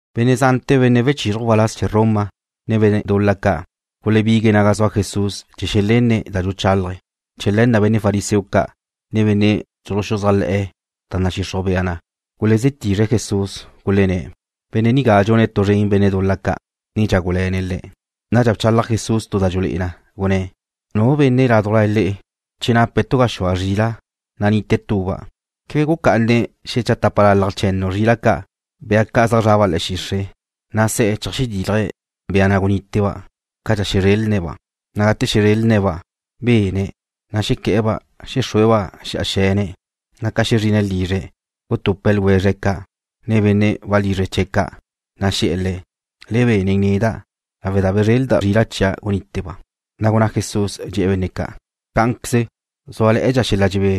Benne' zante̱ benne' wechizruj waláz chee̱ Roma, ne benne' dul-la ca' gulebigue̱' naga zua Jesús chee̱ xelenne̱' da dxuchálaje̱'. Chee̱ le̱ na' benne' fariseo ca', ne benne' dxuluxuzájle̱'e̱ da nadxixruj bea na gulezí tizre̱' Jesús, gulenné̱': ―Benne' nigá dxune̱' tu zren benne' dul-la ca', ne dxágule̱ne̱' le̱'. Nadxa bchalaj Jesús da dxulé'e na, gunné̱': ―Nu benne' ládujla le'e, che nape̱' tu gaxúa zrila', na' nite tuba', ¿quebe gucá'ane̱' xetápalalaj che̱nnu zrila' ca', bea ca' zaj zraba' le̱'e̱ xixre', na' se̱'e̱ cheajdílaje̱' bea na' guníteba' cadxa xezrelne̱'-ba'? Na' gate xezrelne̱'-ba', bene̱', na' xequé̱'e̱-ba' xexrúe̱'-ba' xe̱'a xe̱ne̱'. Na' ca xezrine̱' lizre̱', gutupe̱' ljwezre̱' ca', ne benne' walizre chee̱' ca'. Na' xe̱'e̱ le̱': “Le be nen neda', lawe' da bezrelda' zrila' chia' guníteba'.” Na' gunná Jesús, dxe̱'e̱ benne' ca': ―Cá'anqueze zúale̱'e̱dxa xel-la dxebé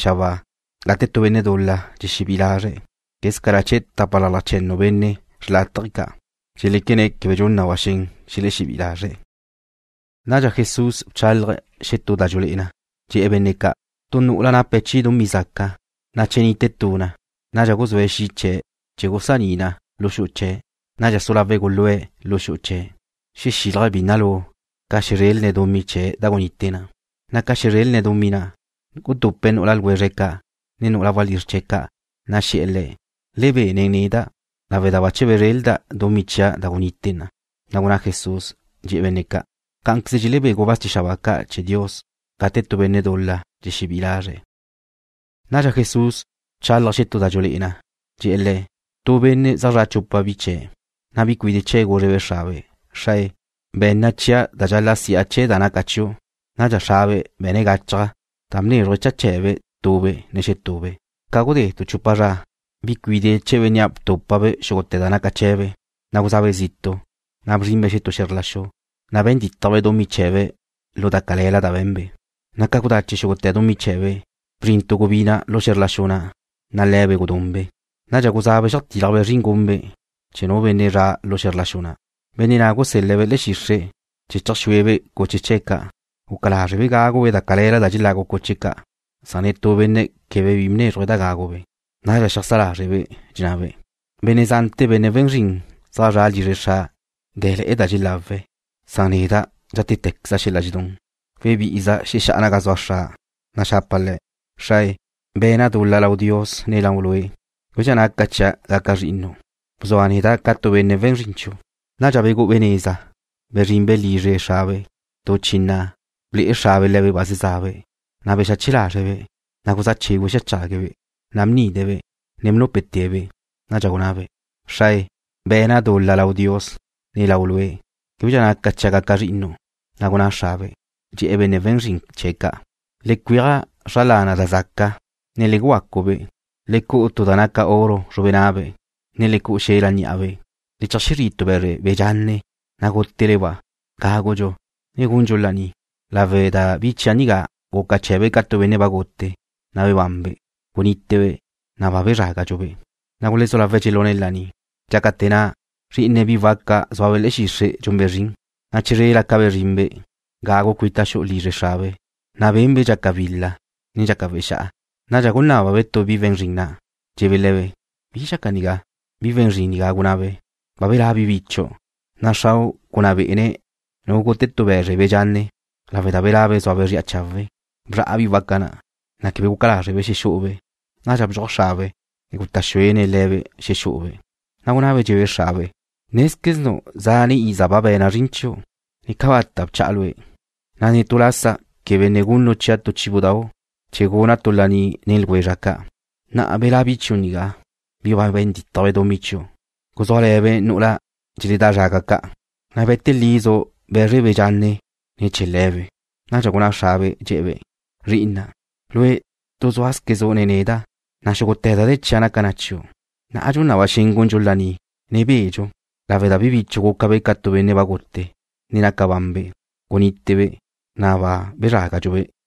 xabáa gate tu benne' dul-la dxexebí'i lazre̱', quézcala chee̱ tápalalaj che̱nnu benne' xrlátaje ca' dxeléquene̱' quebe dxun na ba xen xelexebí'i lazre̱'. Nadxa Jesús bchálaje̱' xetú da dxulé'e na, dxe̱'e̱ benne' ca': ―Tu nu'ula nape̱' chi dumí zaca, na' che nite tu na, nadxa guzúe̱' xi' chee̱' chee̱ gusaní na lu xu'u chee̱'. Nadxa su lawe̱' gulúe̱' lu xu'u chee̱', xexílaje̱' bínnalu ca xezrelne̱' dumí chee̱' da gunite na. Na' ca xezrelne̱' dumí na', gutupe̱' nu'ula ljwezre̱' ca', ne nu'ula walízr chee̱' ca', na' xe̱'e̱ le̱': “Le be nen neda', lawe' da bache bezrelda' dumí chia' da gunite na.” Na' gunná Jesús, dxe̱'e̱ benne' ca': ―Cá'anqueze dxelebé gubáz chee̱ xabáa ca' chee̱ Dios gate tu benne' dul-la dxexebí'i lazre̱'. Nadxa Jesús bchálaje̱' xetú da dxulé'e na, dxe̱'e̱ le̱': ―Tu benne' zaj zra' chupa bi chee̱'. Na' bi cuide' chee̱' gúzrebe' xrabe': “Xrae, be̱nna chia' da dxal-la' si'a chee̱ da naca chiu'.” Nadxa xrabe' be̱ne̱' gachaj da bnézruje̱' cha chee̱be' tube', ne xetube'. Ca gudé tu chupa zra, bi cuide' chee̱ bénnea' btúpabe' xúgute̱ da naca chee̱be', na' guzabe' zitu', na' bzrinbe' xetú xe̱zr la xu. Na' be̱n dítajbe' dumí chee̱be' lu da cale̱la da be̱nbe'. Na' ca gudache xúgute̱ dumí chee̱be', bzrin tu gubina' lu xe̱zr la xu na', na' le̱be' gudunbe'. Nadxa guzabe' xeajtílajbe' zrin gunbe' chee̱ tu benne' lu xe̱zr la xu na'. Benne' na' gusél-le̱'-be' le̱'e̱ xixre' chee̱' chee̱ cheajxúebe' cuche chee̱' ca'. Guca lázrebe' gágube' da cale̱la da dxelagu cuche ca'. Netú benne' quebe bi bnézruje̱' da gágube'. Nadxa xeajsá lázrebe', dxennabe': “Benne' zante̱, benne' we̱n zrin zaj zre̱'e̱ lizre xra', na' dé̱le̱'e̱ da dxelawe̱'. Neda' dxátequeza' xel-la dxedún. Webí'iza' xexá'a naga zua xra', na' xapa' le̱': Xrae, be̱na' dul-la lau Dios, ne lau lue'. Québedxa naca chia' gaca' zri'inu'. Bzua neda' ca tu benne' we̱n zrin chiu'.” Nadxa begú'ube' neza, bezrinbe' lizre xrabe'. ’Tu chi na', ble'e xrabe' le̱be' ba zezabe', na' bexache lazre̱'-be'. Na' guzá chégüe̱' xeajchague̱'-be', na' bnide̱'-be', ne bnúpete̱'-be'. Nadxa gunabe': “Xrae, be̱na' dul-la lau Dios, ne lau lue'. Québedxa naca chia' gaca' zri'inu'.” Na' gunná xrabe', dxe̱'e̱ benne' we̱n zrin chee̱' ca': “Le cueaj zra lana' da zaca, ne le gugacu-be'. Le cu'u tu da naca oro zrube nabe', ne le cu'u xel-la ní'abe'. Le cheajzrí' tu be̱zre be̱ dxanne, na' gútele-ba'. Gágudxu, ne gundxu laní, lawe' da bi chia' nigá guca chee̱be' ca tu benne' ba gute, na' bebanbe'. Gunítebe', na' ba bezrágadxu-be'.” Na' gulezú lawe̱' dxelune̱' laní. ’Dxácate̱ na', zrí'ine̱' bi waca zúabe' le̱'e̱ xixre' dxunbe' zrin. Na' chizrela' ca bezrinbe' gagu cuita xu'u lizre xrabe', na' benbe' dxaca wil-la, ne dxaca wexá'a. Nadxa gunné̱be' tu bi we̱n zrin na', dxe̱'e̱be' le̱be': “¿Bi dxaca nigá?” Bi we̱n zrin nigá cúnnabe': “Ba belá' bi bichu', na' xrau' gunná bé'ene̱' nu gute tu be̱zre be̱ dxanne, lawe' da belabe' zúabe' zri'a chawe'.” Bzra'a bi waca na', na' quebe guca lázrebe' xexú'ube'. Nadxa bdxuaj xrabe', ne guta' xuene̱' le̱be' xexú'ube'. Na' cúnnabe', dxe̱'e̱be' xrabe': “Nézqueznu' zane' iza ba be̱na' zrin chiu', ne cabata' bcha'a lue', na' ne tu lasa quebe ne gunnu' chia' tu chíbudau' chee̱ guna' tu laní nen ljwezra' ca'. Na'a belá' bi chiu' nigá, bi ba be̱n dítajbe' dumí chiu', guzúale̱be' nu'ula dxeledá zraga ca', na' be̱te lizu' be̱zre be̱ dxanne ne̱ chee̱ le̱be'.” Nadxa gunná xrabe', dxe̱'e̱-be': “Zri'ina', lue' tu zúale̱zquezu' nen neda', na' xúgute̱ da de̱ chia' naca na chiu'. Na'a dxun na ba xen gundxu laní, ne bedxu, lawe' da bi bichu' gúcabe' ca tu benne' ba gute, ne naca banbe'. Gunítebe', na' ba bezrágadxu-be'.”